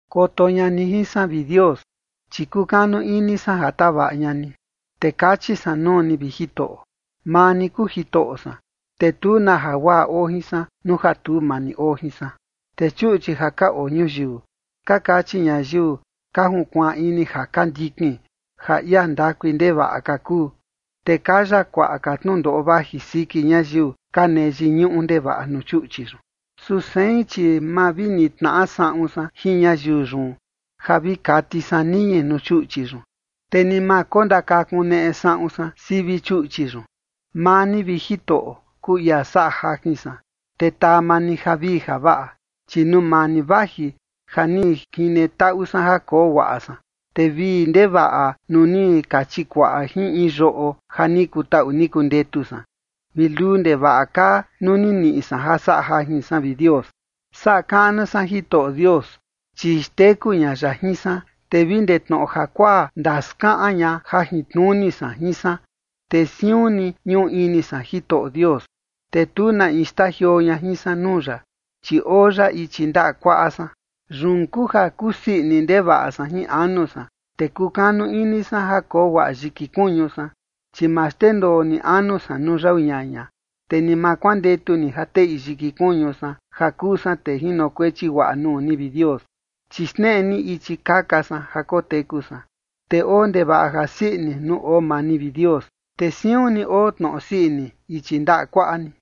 Koto ña ni jin san, vi Dios, chi kukanu ini san ja tavaꞌa ña ni. Te kachi san nuu ni, vi Jitoꞌo: “Maa ni kuu Jitoꞌo san, te tu na jaguaꞌa oo jin san nuu ja tu maa ni oo jin san”. Te chuꞌchi ja ka oo ñuyiu, ka kachi ñayiu ka junkuaan ini ja ka ndikin, ja ia ndakui ndevaꞌa ka kuu. Te kaya kuaꞌa ka tnundoꞌo vaji siki ñayiu ka nee yiñuꞌu ndevaꞌa nuu chuꞌchi yun. Su sein, chi ma vi nitnaꞌa saꞌun san jin ñayiu yun ja vi kati san niñi nuu chuꞌchi yun, te ni ma kondakakuneꞌe saꞌun san sivi chuꞌchi yun. Maa ni, vi Jitoꞌo, kuu ia saꞌa jajin san, te taa maa ni javii javaꞌa, chi nuu maa ni vaji ja ni jine taꞌu san ja koo guaꞌa san. Te vii ndevaꞌa nuu ni ka chikuaꞌa jin in yoꞌo ja ni kutaꞌu ni kundetu san, vi luu ndevaꞌa kaa nuu ni niꞌi san ja saꞌa jajin san, vi Dios. Saꞌa kaꞌnu san Jitoꞌo Dios, chi xteku ña ya jin san, te vi ndee tnoꞌo jakuaa ndaskaꞌan ña jajintnuni san jin san. Te siun ni ñuu ini san Jitoꞌo Dios, te tu na in xtajioo ña jin san nuu ya, chi oo ya ichi ndaꞌa kuaꞌa san. Yun kuu ja kusii ini ndevaꞌa san jin anu san, te kukanu ini san ja koo guaꞌa yiki kuñu san. Chi ma xndendoo ni anu san nuu yau ñaña, te ni ma kuandetu ni ja teꞌi yiki kuñu san, ja kuu san tee jinokuechi guaꞌa nuu ni, vi Dios. Chi xneꞌe ni ichi kaka san ja koteku san, te oo ndevaꞌa jasii ini nuu oo maa ni, vi Dios, te siun ni oo tnoꞌo sii ini ichi ndaꞌa kuaꞌa ni.